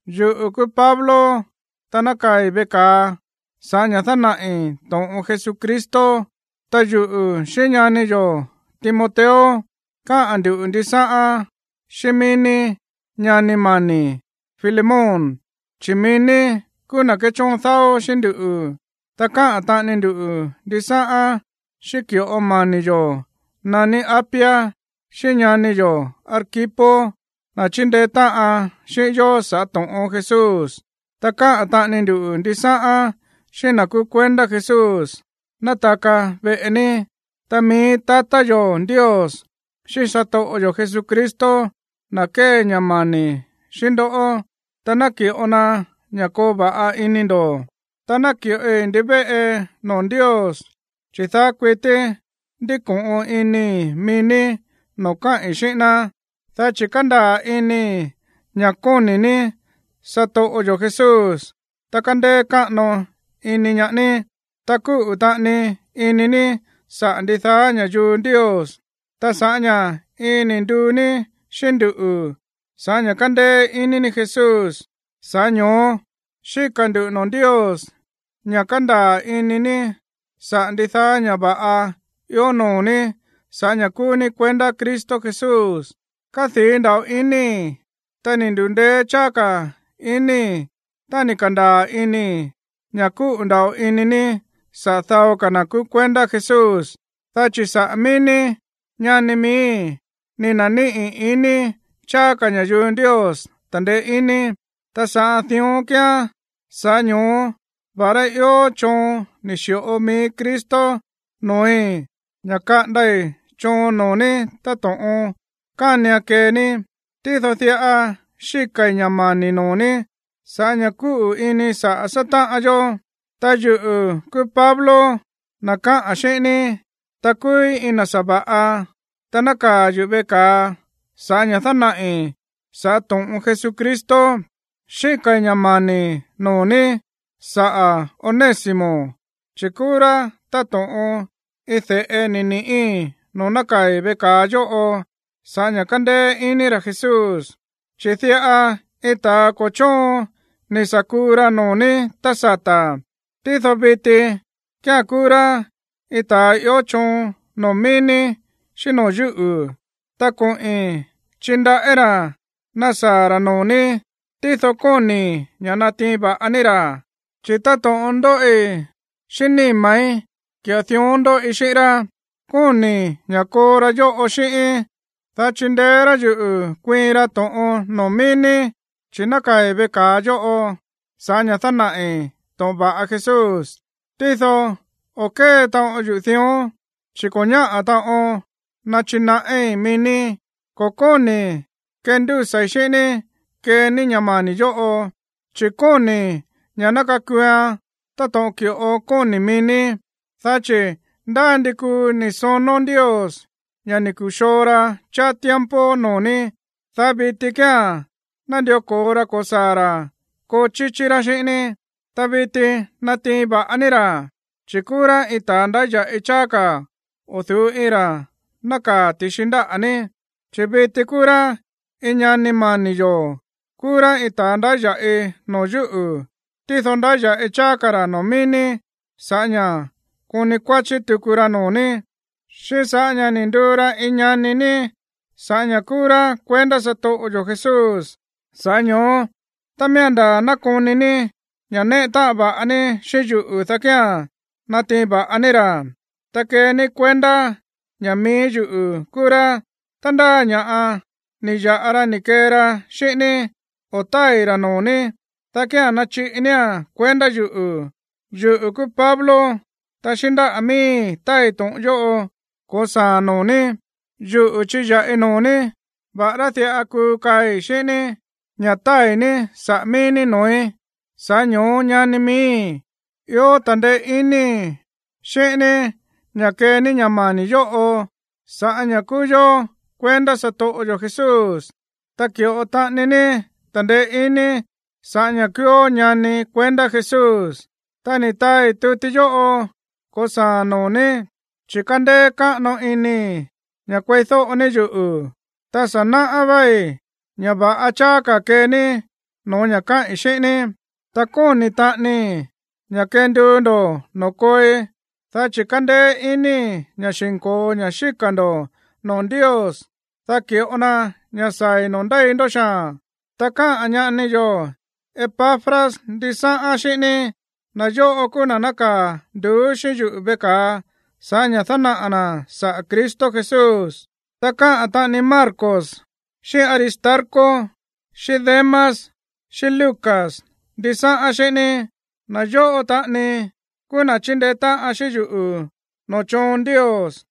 Yuꞌu̱ kúú Pablo, ta nákaa̱i̱ veꞌe ka̱a sa̱ꞌá ña̱ dánaꞌi̱ to̱ꞌon Jesucristo. Ta yuꞌu̱ xíꞌín ñani yo̱ Timoteo káꞌa̱n ndu̱ ndisáꞌán xíꞌín míí ní, ñani mani̱ Filemón, chi̱ mií ní kúú na̱ kéchóon dáó xíꞌín nduꞌu̱, ta káꞌa̱n taꞌani ndu ndisáꞌán xíꞌín ki̱ꞌo mani̱ yo̱ naní Apia, xíꞌín ñani yo̱ Arquipo, na̱ chíndeé táꞌan xíꞌín yó sa̱ꞌá to̱ꞌon Jesús, ta káꞌa̱n taꞌani ndu ndisáꞌán xíꞌín na̱ kúú kuendá Jesús nátaka veꞌe ní. Ta mií tatá yo̱ Ndios xíꞌín satoꞌo yo̱ Jesucristo ná kee ña̱ mani̱ xíꞌín ndoꞌó, ta ná ki̱ꞌo na ña̱ koo va̱ꞌa ini ndo̱. Ta náki̱ꞌoi ndivéꞌe noo̱ Ndios, chi̱ daá kuití ndíko̱ꞌon inii̱ mií ní noo̱ káꞌi̱n xíꞌín ná, dá chi̱ kándaa̱ inii̱ ña̱ kóni̱ ní satoꞌo yo̱ Jesús, ta kándéé káꞌano iní ñaá ní, ta kúꞌu̱ taꞌani ini ní saꞌa̱ ndidaá ña̱yuu Ndios. Ta sa̱ꞌá ña̱ iin ni̱ nduu ní xíꞌín nduꞌu̱ sa̱ꞌá ña̱ kándéé iní ní Jesús, sa̱ꞌá ño̱ó xíka̱ ndu̱ noo̱ Ndios ña̱ kandaa̱ ini ní saꞌa̱ ndidaá ña̱ va̱ꞌa ió noo̱ ní sa̱ꞌá ña̱ kúú ní kuendá Cristo Jesús. Kádii̱ nda̱ꞌo inii̱, ta ni̱ ndu̱ndeé cháá ka̱ inii̱ tá ni̱ ka̱ndaa̱ inii̱ ña̱ kúꞌu̱ nda̱ꞌo ini ní saꞌa̱ dao ka̱ na̱ kúú kuendá Jesús. Dá chi̱ saꞌa̱ mií ní, ñani miíi̱, ni̱ na̱níꞌi̱ ini cháá ka̱ ña̱yuu Ndios ta̱ndeé iní. Ta sa̱ꞌá ña̱ dión kíán, sa̱ꞌá ño̱ó va̱ꞌará ió choon ni̱ xi̱ꞌo mií Cristo no̱ói̱ ña̱ kaꞌandai̱ choon noo̱ ní táto̱ꞌon kánian kee ní, tído diꞌa xíka̱i̱ ña̱ mani̱ noo̱ ní sa̱ꞌá ña̱ kúꞌu̱ ini saꞌa̱ sátáꞌan yó. Ta yuꞌu̱ kúú Pablo, na̱ káꞌa̱n xíꞌín ní, ta kúúí iin na̱ sa̱va̱ꞌa, ta nákaa̱ yuꞌu̱ veꞌe ka̱a sa̱ꞌá ña̱ dánaꞌi̱ sa̱ꞌá to̱ꞌon Jesucristo. Xíka̱i̱ ña̱ mani̱ noo̱ ní saꞌa̱ Onésimo, chi̱ kúú rá táto̱ꞌon iin de̱ꞌe ni̱ ni̱ꞌí noo̱ nákaa̱i̱ veꞌe ka̱a yóꞌo sa̱ꞌá ña̱ kándéé iní ra̱ Jesús. Chi̱ diꞌa iin ta̱ ko̱ chóon ni̱ sa̱ kuu ra noo̱ ní tá sata̱, tído viti kía̱n kúú rá iin ta̱ ió choon noo̱ mií ní xíꞌín noo̱ yúꞌu̱. Ta koꞌi̱n chindaꞌí ra̱ nasaa̱ ra̱ noo̱ ní, tído kóni̱i̱ ña̱ natiin va̱ꞌa ní ra̱, chi̱ táto̱ꞌon ndóꞌi xíꞌín níma̱í, ki̱ꞌo dión ndóꞌi xíꞌín rá. Kóni̱i̱ ña̱ koo ra̱ yóꞌo xíꞌíín, dá chindeé rá yuꞌu̱ kuiin ra to̱ꞌon noo̱ mií ní, chi̱ nákaa̱i̱ veꞌe ka̱a yóꞌo sa̱ꞌá ña̱ dánaꞌi̱ to̱ꞌon va̱ꞌa Jesús. Tído o̱ kée taꞌon yuꞌu̱ dión, chi̱ ko̱ ñáꞌa̱ taꞌon nachinaꞌí mií ní. Ko̱ kóni̱i̱ kendúsa̱i̱ xíꞌín ní kee ní ña̱ mani̱ yóꞌo, chi̱ kóni̱i̱ ña̱ ná kakuuan táto̱ꞌon ki̱ꞌo kóni̱ mií ní. Dá chi̱ ndá ndi kuu ni̱ sonó Ndios ña̱ ni̱ ku̱xoo ra cháá tiempo noo̱ ní, dá viti kía̱n nandió ko̱o ra ko̱saa̱ ra̱ koo chíchí rá xíꞌín ní. Ta viti natiin va̱ꞌa ní ra̱, chi̱ kúú rá iin ta̱ ndáya̱ꞌi cháá ka̱ o̱ du̱ú iin ra̱ nákaa̱ ti̱xi ndáꞌa̱ ní, chi̱ viti kúú rá iin ñani mani̱ yo̱. Kúú rá iin ta̱ ndáya̱ꞌi noo̱ yúꞌu̱, tído ndáya̱ꞌi cháá ka̱ ra̱ noo̱ mií ní sa̱ꞌá ña̱ koni kuáchí tuku ra noo̱ ní, xíꞌín sa̱ꞌá ña̱ ni̱ nduu ra iin ñani ní sa̱ꞌá ña̱ kúú rá kuendá satoꞌo yo̱ Jesús. Sa̱ꞌá ño̱ó, tá miía̱n ndaa̱ nákoni ní ña̱ néꞌe táꞌan va̱ꞌa ní xíꞌín yuꞌu̱, dá kía̱n natiin va̱ꞌa ní ra̱, ta kee ní kuendá ña̱ mií yuꞌu̱ kúú rá. Tá ndá ña̱ꞌa ni̱ ya̱ꞌa ra ni̱ kee ra xíꞌín ní, o tá tái̱ ra̱ noo̱ ní, dá kía̱n nachiꞌi nía̱n kuendá yuꞌu̱. Yuꞌu̱ kúú Pablo, ta xíꞌín ndáꞌa̱ miíi̱ táai to̱ꞌon yóꞌo ko̱saa̱a̱n noo̱ ní. Yuꞌu̱ chiya̱ꞌi noo̱ ní, va̱ꞌará diꞌa kuu kaai̱ xíꞌín ní ña̱ tái̱ ní saꞌa̱ mií ní noo̱í. Sa̱ꞌá ño̱ó, ñani miíi̱, ió ta̱ndeé iníi̱ xíꞌín ní ña̱ kee ní ña̱ mani̱ yóꞌo sa̱ꞌá ña̱ kúú yó kuendá satoꞌo yo̱ Jesús, ta ki̱ꞌo taꞌani ní ta̱ndeé iníi̱ sa̱ꞌá ña̱ kúúó ñani kuendá Jesús. Ta ni̱ taai tuti yóꞌo ko̱saa̱ noo̱ ní, chi̱ kándéé káꞌano inii̱ ña̱ kueídóꞌo ní yuꞌu̱. Ta sa̱ náꞌá váí ña̱ va̱ꞌa cháá ka̱ kee ní no̱ó ña̱ káꞌi̱n xíꞌín ní. Ta kóni̱ taꞌanii ña̱ kenduu ndo̱ noo̱ kooi, dá chi̱ kándéé inii̱ ña̱ xi̱nko̱o ña̱ xíka̱ ndo̱ noo̱ Ndios, dá ki̱ꞌo na ña̱ saa̱i̱ noo̱ ndéi ndó xaa̱n. Ta káꞌa̱n ñani yo̱ Epafras ndisáꞌán xíꞌín ní. Na̱ yóꞌo kúú na̱ nákaa̱ nduú xíꞌín yuꞌu̱ veꞌe ka̱a sa̱ꞌá ña̱ dánaꞌa̱ na̱ saꞌa̱ Cristo Jesús. Ta káꞌa̱n taꞌani Marcos, xíꞌín Aristarco, xíꞌín Demas, xíꞌín Lucas ndisáꞌán xíꞌín ní. Na̱ yóꞌo taꞌani kúú na̱ chíndeé táꞌan xíꞌín yuꞌu̱ noo̱ choon Ndios.